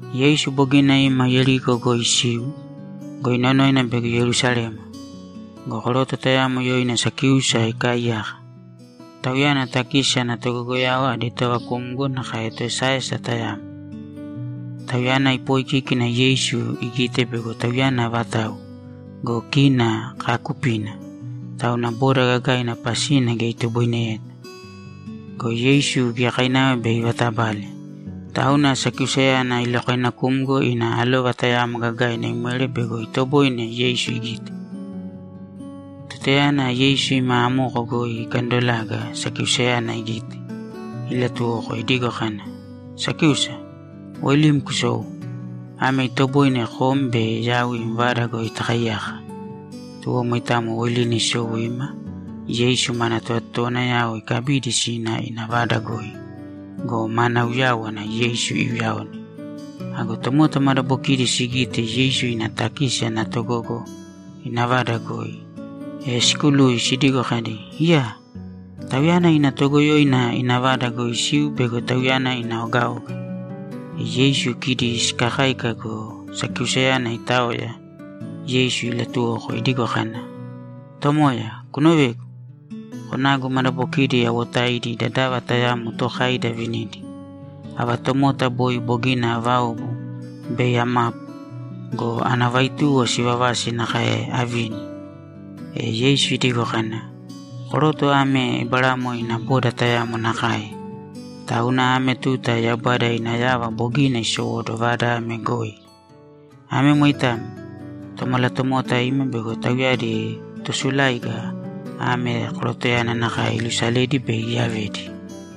Yeisu bogina ima Yeriko goi isiu go, inonoina bego Yerusalema. Go koroto tayamo yoina Sakíusa ikaaiyaka. Tauyana takisi ana togogoyao adi tovakumgo nakae toesaesa tayamo. Tauyana ipooikíkina Yeisu igite bego Tauyana avatau go, kina kaakupina, tauna boda gagaina pasina geya itoboineyeta. Go Yeisu giyakainava bei ivatabale, tauna Sakiusayana ilokoinakumgo ina alova tayamo gagaina imwere bego itoboine Yeisu igite. Tutayana Yeisu ima amoko goi ikandolaga, Sakiusayana igite, ilatuwoko idigo kana, ‘Sakíusa, woilīm kusōu. Ame itoboine kom be yau im vada goi takaiyaka.’ Tuwo moitamo woilina isou ima Yeisu mana tovatotowanayao ikabidi sina ina vada goi go, mana uyáwana Yeisu iuyaone. Ago tomota madabokidi sigite Yeisu ina takisi ana togogo ina vada goi, e sikului sidigo kadi, ‘Iyaa! Tauyana ina toogoyoina ina vada goi isiu bego tauyana ina ogaoga.’ E Yeisu kidi sikakáika go, Sakiusayana itaoya, Yeisu ilatuwoko idigo kana, ‘Tomoya, kunovēgu! Konagu madabokidi awotaidi dadava tayamo tookaidi avinidi. Ava tomota boi bogina aavaobu, bei amapu go, ana vaituwo sivavasi nakae avini.’ E Yeisu idigo kana, ‘Koroto ame Eberamo ina boda tayamo nakae, tauna ame tuta Yaubada ina yava bogina isowóduwo vada ame goi. Ame moitamo. Tomalatomota ima bego tauyadi tosuláiga ame korotoyana nakae ilusaledi be iyavedi.’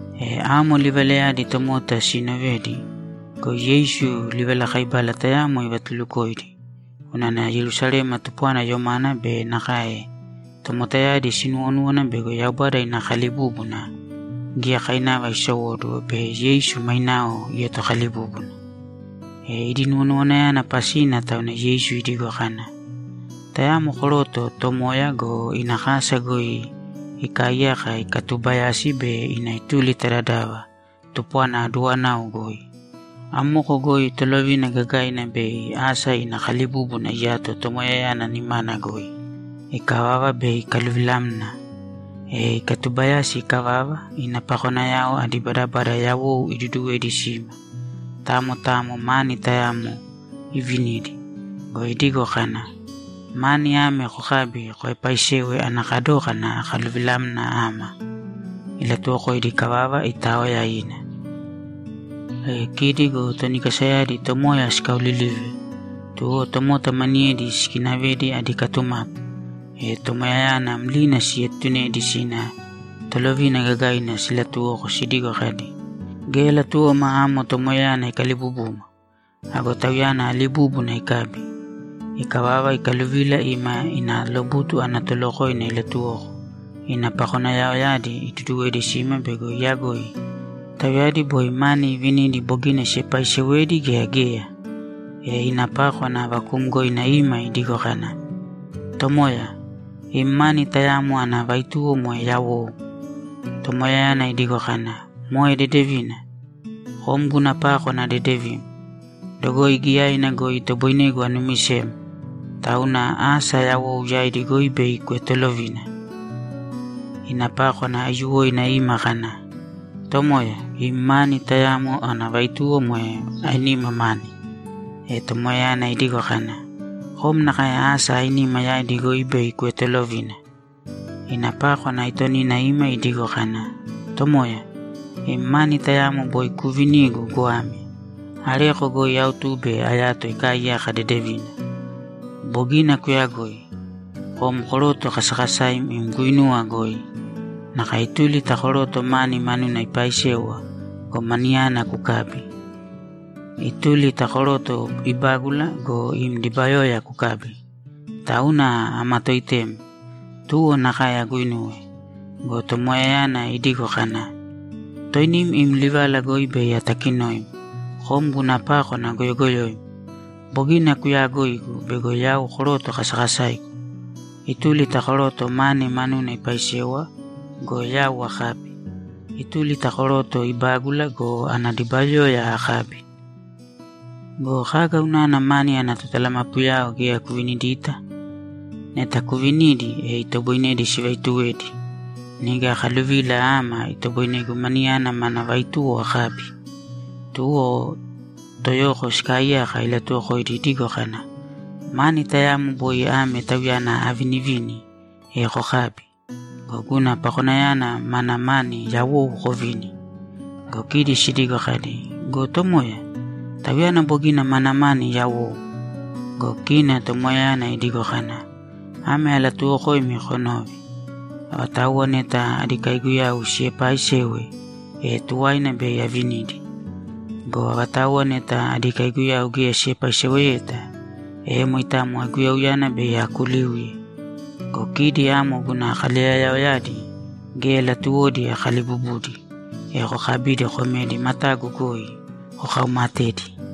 E amo livalayadi tomota siinovedi go, Yeisu livalakaibala tayamo ivatulukoidi unana Yerusalema tupwana yomana be nakae tomotayadi sinuwonúwana bego Yaubada ina kalibúbuna giyakainava isowóduwo be Yeisu mainao ietokalibúbuna. Idi nuwonuwanayana pasina tauna Yeisu idigo kana, ‘Tayamo koroto tomoya go, ina kasa goi ikaaiyaka ikatubayasi bei ina ituli ta dadava tupwana aduwanau goi. Amoko goi tolovina gagaina bei asa ina kalibúbuna iyato tomoyayana nimana goi. Ikavava, bei ikaluvilamna. E ikatubayasi ikavava, ina pakonayao adi badabada yawou iduduwedi sima, tamo tamo mani tayamo ivinidi go, idigo kana, “Mani ame kokābi koepaisēwe ana kadókana akaluvilamna ama.” Ilatuwokoidi ikavava, itaoya ina. E kidi go toni kasayadi tomoya sikaolilive, tuwo tomota maniyedi sikinavedi adi katumapu, e tomoyayana mlina sietunedi sina tolovina gagaina silatuwoko sidigo kadi, “Geya latuwoma amo tomoyayana ikalibubuma.” Ago tauyana alibúbuna ikabi. Ikavava, ikaluvila ima ina lobutu ana tolokoina ilatuwoko ina pakonayaoyadi iduduwedi sima bego iyagoi tauyadi boi mani ivinidi bogina siepaisewedi gea geya? E ina pákwana vakuumgoina ima idigo kana, “Tomoya, im mani tayamo ana vaituwo moe yawou.” Tomoyayana idigo kana, “Moe dedevina! Kom guna pákwana dedevim. Dogoi giyaina goi itoboinegu anumisem, tauna asa yawou yaidi goi bei kuetolovīna.” Ina pákwana aiyuwoina ima kana, “Tomoya, im mani tayamo ana vaituwo moe ainima mani.” E tomoyayana idigo kana, “Kom nakae asa ainima yaidi goi bei kuetolovīna.” Ina pákwana aitonina ima idigo kana, “Tomoya, im mani tayamo boi kuuvinigu goame. Areko goi autube ayato ikaaiyaka dedevina. Bogina kuyagoi. Kom koroto kasakasaim im guinuwa goi. Nakae ituli ta koroto mani manuna ipaisewa go, maniyana kukabi. Ituli ta koroto ibágula go, ina dibayoya kukabi. Tauna amatoitem. Tuwo nakae aguinuwe.” Go tomoyayana idigo kana, “Toinim im livala goi bei atakinoim, kom guna pákwana goyogoyoim. Bogina kuyaagoigu bego yau koroto kasakasaigu. Ituli ta koroto mani manuna ipaisewa go, yau akabi. Ituli ta koroto ibágula go, ana dibayoya akabi. Go kaga unana mani ana totalamapuyao geya kuvinidita? Neta kuvinidi, e itoboinedi sivaituwedi. Niga akaluvila ama itoboinegu maniyana mana vaituwo akabi.” Tuwo toyoko sikaaiyaka ilatuwokoidi idigo kana, “Mani tayamo boi ame tauyana avinivini, e kokābi go, guna pakonayana maana mani yawou kovīni.” Go kidi sidigo kadi, “Go tomoya, tauyana bogina maana mani yawou.” Go kina tomoyayana idigo kana, “Ame alatuuwokoimi konōve: Avatauwa neta adi kaiguyau siepaaisewe, e tuwaina bei avinidi. Go avatauwa neta adi kaiguyau geya siepaiseweyeta, e moitamo aiguyauyana bei akuliuye. Go kidi amo guna kaleyayaoyadi geya latuwodi akalibubudi, e kokabīdi komēdi matagu goi kokaumatēdi.”’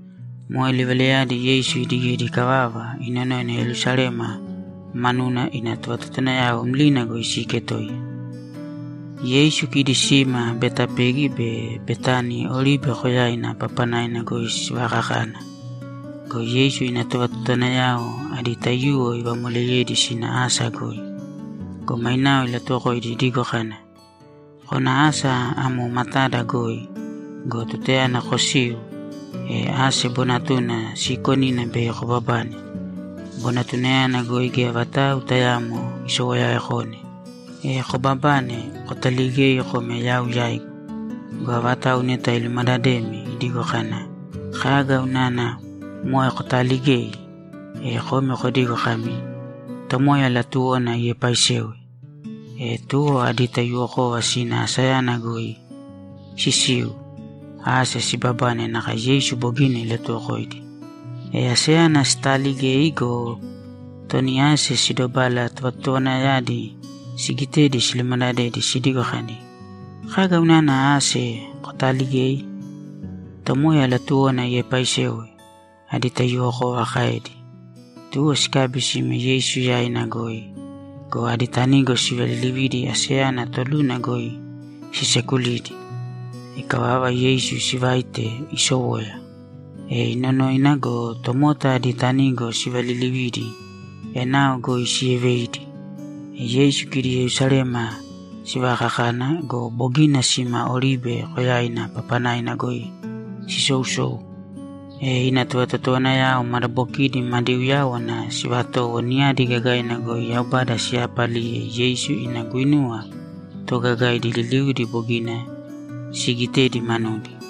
Moe livalayadi Yeisu idigedi ikavava, inonoina Yerusalema manuna, ina tovatotowanayao mlina goi siiketoiya. Yeisu kidi sima Betapegi be Betani Oribe Koyaina papanaina goi sivakakana. Go Yeisu ina tovatotowanayao adi taiyuwo ivamoleyedi sina asa goi. Go mainao ilatuwokoidi idigo kana, ‘Kōna asa amo matada goi go, tutayana kosiu, ase bonatuna siikonina bei kobabane. Bonatunayana goi geya vatau tayaamo isowoyakone. E kobabane, kotaligēi kōme yau yaigu. Go avatau neta ilumadademi idigo kana, “Kaga unana moe kotaaligei?” e komi kodīgo kami, “Tomoya latuwona iepaisewe.”’ E tuwo adi taiyuwokova sina asayana goi sisiu, ase sibabane nakae Yeisu bogina ilatuwokoidi. E aseyana sitaaligei go, toni ase sidobala tovatotowanayadi sigitedi silumadadedi sidigo kadi, ‘Kaga unana ase kotaaligei?’ ‘Tomoya latuwona iepaisewe’, adi taiyuwokova kaedi. Tuwo sikabi sime Yeisu yaina goi go, adi tanigo sivalilividi aseyana toluna goi sisekulidi. Ikavava, Yeisu sivaite isowoya. E inonoina go, tomota adi tanigo sivalilividi enao goi sieveidi. E Yeisu kidi Yerusalema sivakakana go, bogina sima Oribe Koyaina papanaina goi sisousou, e ina tovatotowanayao madabokidi madi uyáwana sivatowo niyadi gagaina goi Yaubada siyapaliye Yeisu ina guinuwa toogagaidi liliudi bogina siigitedi manudi.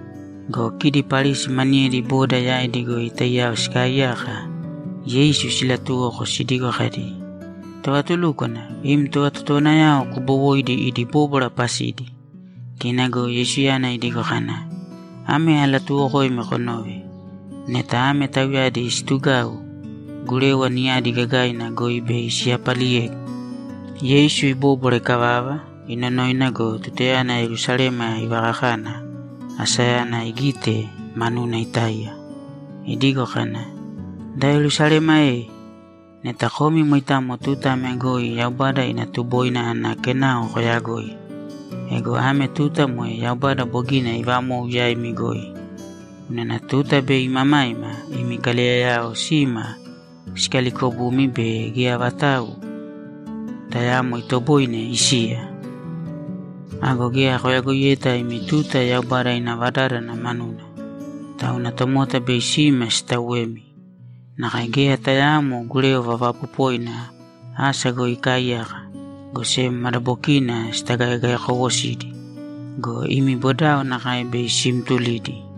Go kidi Parisi maniyedi boda yaidi goi taiyao sikaaiyaka Yeisu silatuwoko sidigo kadi, ‘Tovatulúkwana, im tovatotowanayao kubowōidi idi bóbwara pasidi.’ Kina go Yeisuyana idigo kana, ‘Ame alatuuwokoimi konōve: Neta ame tauyadi situgau, gurewa niyadi gagaina goi bei siyapaliyegu.’ Yeisu ibóbwara ikavava, inonoina go, tutayana Yerusalema ivakakana, asayana igite, manuna itáiya idigo kana, ‘Da Yerusalema e, neta komi moitamo tuta ame goi Yaubada ina tuboina ana kenao koyagoi. Ego ame tuta moe Yaubada bogina ivamou yaimi goi. Unana tuta bei imamaima imi kaleyayao sima sikalikobumi be geya vatau tayaamo itoboine isiya. Ago geya koyagoiyeta imi tuta Yaubada ina vadádana manuna. Tauna tomota bei sima sitauwemi. Nakae geya tayaamo gurewa vaapopoina asa goi ikaaiyaka, go sem madabokina sitagaegaekowosidi. Go imi bodao nakae bei simtulidi.’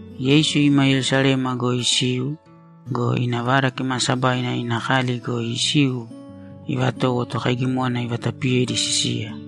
Yeisu ima Yerusalema goi isiu go, ina Vada Kimaasabaina ina kali goi isiu ivatowo tokaigimona ivatapiyedi sisiya.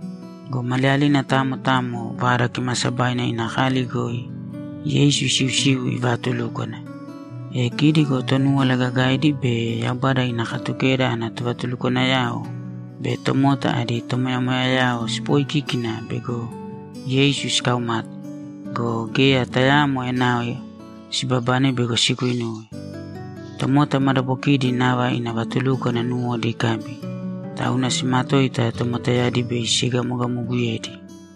Go maliyalina tamo tamo Vada Kimaasabaina ina kali goi Yeisu isiusiu ivaatulúkwana. E kidi go Tonúwala Gagaidi be Yaubada ina Katukeda ana tovatulukwanayao be tomota adi tomoyamoyayao sipooikíkina bego Yeisu sikaumate go, geya tayaamo enao sibabane bego siguinuwe. Tomota madabokidi nava ina vatulúkwana nuwodi ikabi, tauna simatoita tomotayadi be siegamogamoguyedi.